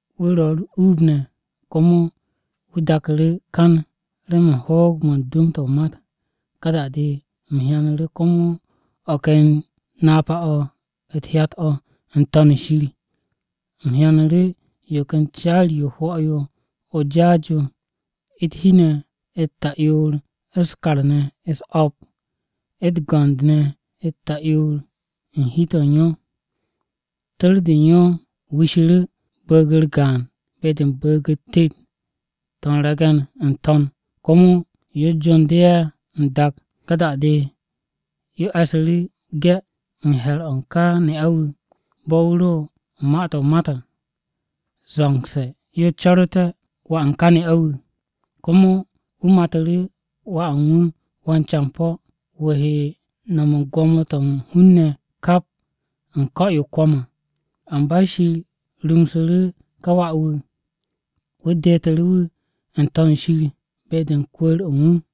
Wu̱ ro̱ u̱r-uub ne̱, komo wu̱ daku̱ru̱ kan remen hoog-mo̱ u̱n dwu̱m-to̱ o-mat. Ka da-de u̱m hyanu̱ru̱ komo o̱ ken napa-o̱ u̱t-hyat o̱ n-To̱n shir. U̱m hyanu̱ru̱ yo ken caari-yo o-hwo̱ o̱ o-jaas yo yo, u̱t-hi ne̱ u̱t-ta'yoor u̱s-kar ne̱ u̱s-o̱p, u̱t-go̱nd ne̱ u̱t-ta'yoor u̱n hi-to̱ u̱n yo. Tu̱r-de u̱n yo wishu̱ru̱ bu̱u̱g-u̱r gaan be-de u̱n bu̱u̱g-u̱t tet-to̱ u̱n re̱ge̱n n-to̱n, komo yo jondu̱ ye̱ n-dak. Ka da-de yo e̱su̱ru̱ 'ge̱ u̱n he̱r-o̱ u̱n ka ne'a-wu̱, bo̱ wu̱ ro̱ u̱n ma-to̱ mat à, zo̱ngse̱ yo co̱ru̱te̱ wà u̱n ka ne'a-wu̱. Komo wu̱ matu̱ru̱ wà u̱n wu̱ wan-campo̱, wu̱ he no̱m u̱n gwo̱mo-to̱ u̱n hun-ne̱ kap u̱n ko̱-yo o-kwo̱m à. Amba Shir rumsu̱ru̱ ká wà-wu̱ wu̱ detu̱ru̱ wu̱ n-To̱n o-shir be-de u̱n kwu̱u̱r-o̱ u̱n wu̱.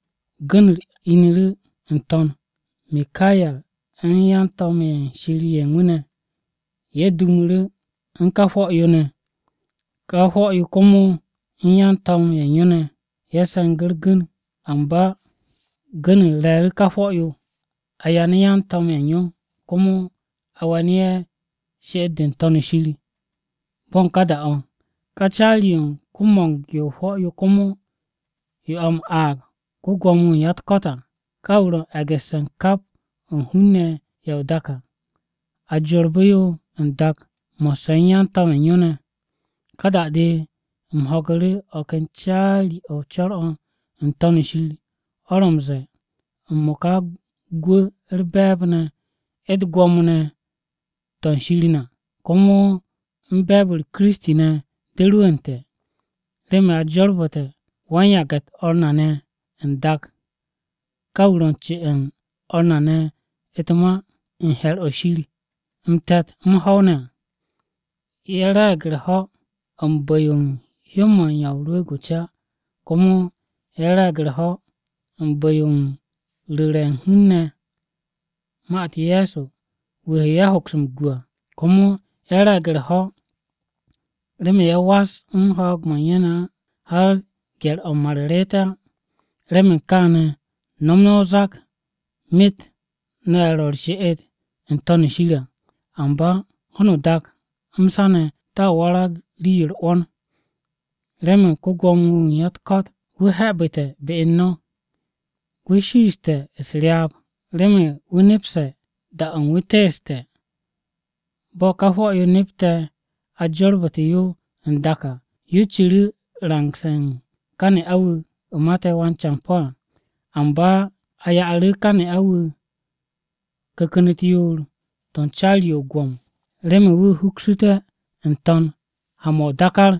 Gu̱n-u̱r argu̱ m-ine̱ n-To̱n. Mikaye̱r u̱n yan-to̱m-ye̱ Shir ye̱ u̱n wu̱ ne̱ ye̱ dumu̱ru̱ u̱n ka hwo̱-yo ne̱, ka hwo̱-yo komo u̱n yan-to̱m ye̱ u̱n yo ne̱ ye̱ se̱ngu̱ u̱r-gu̱n. Amba gu̱n-u̱r re̱e̱ru̱ ka hwo̱-yo, a yanu̱ yan-to̱m ye̱ u̱n yo, komo a we̱nu̱ ye̱ she'et-de n-To̱n shir bo̱ u̱n ka da-o̱. Ka caari-yo u̱n ko-mo̱ng-yo hwo̱-yo, komo yo a m-aag ko-Gwo̱mo-wu̱ u̱n ya-u̱t-ko̱t à, ka wu̱ ro̱ u̱n e̱gu̱sse̱ kap o̱ u̱n hun-ne̱ ye̱ o-dak à. A jorbu̱ yo n-dak mo̱sse̱ u̱n yan-to̱m ye̱ u̱n yo ne̱. Ka da-de, u̱m ho̱gu̱ru̱ o̱ ken caari-o̱ u̱n co̱r-o̱ n-To̱n shir o̱ ro̱ m-ze̱e̱, “M-mo̱ka gwu̱, u̱r-be̱e̱b ne̱, u̱t-gwo̱mo ne̱ to̱ u̱n Shir na, komo u̱n be̱e̱b-u̱r Kiristi ne̱ rwu̱u̱nte̱. Remen a jorbu̱ssu̱te̱ wan-yage̱-u̱t o̱r na ne̱ n-dak, ká wu̱ ro̱ u̱n ce'e̱ u̱n o̱r na ne̱ u̱t-ma u̱n he̱r o̱ Shir m-te̱t, m-ho̱w ne̱ à. Ye̱ re̱e̱g u̱r-ho̱ u̱n bu̱-yo u̱n hyó-mo̱ u̱n Ya o-Rwu̱u̱g o-Ca Komo ye̱ re̱e̱g u̱r-ho̱ u̱n bu̱-yo ye̱ ru̱ru̱te̱ hun-ne̱ ne̱ ma-u̱t Ye̱so wu̱ he ye̱ hoks m-gu à. Komo ye̱ re̱e̱g u̱r-ho̱ remen ye̱ was u̱n ho̱o̱g-mo̱ u̱n ye̱ ne̱ á har gye̱r-o̱ m-mar reet ye̱ á. Remen kaane̱, no̱m no̱ o-zak myet no̱ ye̱ ro̱ u̱r-she'et n-To̱n shir à! Amba ho̱no o-dak m-sa ne̱ to̱a warag rii-yo u̱r-'wo̱n! Remen ko-Gwo̱mo-wu̱ u̱n ya-u̱t-ko̱t wu̱ he̱'e̱bu̱te̱ be u̱n no̱! Wu̱ shiishe̱ u̱s-ryaab, remen wu̱ nepse̱ da-o̱ u̱n wu̱ teeste̱.” Bo̱ ka hwo̱-yo nepte̱ a jorbu̱te̱ yo n-dak à, yo ciru̱ rangse̱ u̱n ka ne'a-wu̱ mate̱ wan-campo̱ à. Amba a ya'u̱ru̱ ka ne'a-wu̱ ku̱ku̱n-u̱t yoor-to̱ u̱n caari-yo o-gwo̱m remen wu̱ huksu̱té̱ n-to̱n ha-mo̱ o-dákár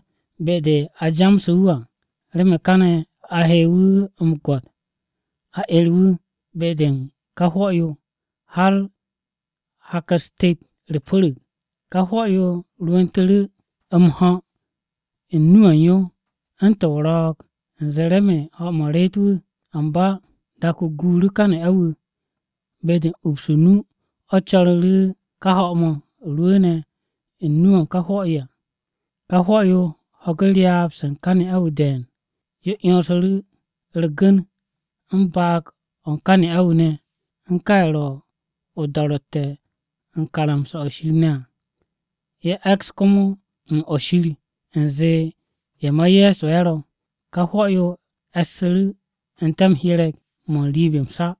be-de a jamsu̱ wu̱ à remen káne̱ a he wu̱ m-gwo̱t a 'er wu̱ be-de u̱n ka hwo̱-yo har hak-u̱s tet u̱r-pu̱ru̱g. Ka hwo̱-yo rwu̱ntu̱ru̱ m-ho̱ u̱n nu-o̱ u̱n yo u̱ntu̱n o-ro̱o̱g, u̱nze remen ho̱-mo̱ reet wu̱. Amba dak-o guuru̱ ka ne'a-wu̱, be-de u̱n ups o-nu, o̱ co̱ru̱ru̱ ka ho̱-mo̱ rwu̱u̱ne̱ u̱n nu-o̱ o-hwo̱ à. Ka hwo̱-yo ho̱gu̱ ryaab-se u̱n ka ne'a-wu̱ de̱e̱n. Yo 'yonsundu̱ru̱ u̱r-gu̱n u̱n baag-o̱ u̱n ka ne'a-wu̱ ne̱, u̱n ká ye̱ ro̱ o-do̱ro̱tte̱ u̱n karamsa-to̱ Shir ne̱ à, ye̱ e̱ks komo u̱n o̱ Shir u̱nze ye̱ ma Ye̱so ye̱ ro̱. Ka hwo̱-yo e̱su̱ru̱ n-te̱ m-hyereg mo̱ n-riib m-sa.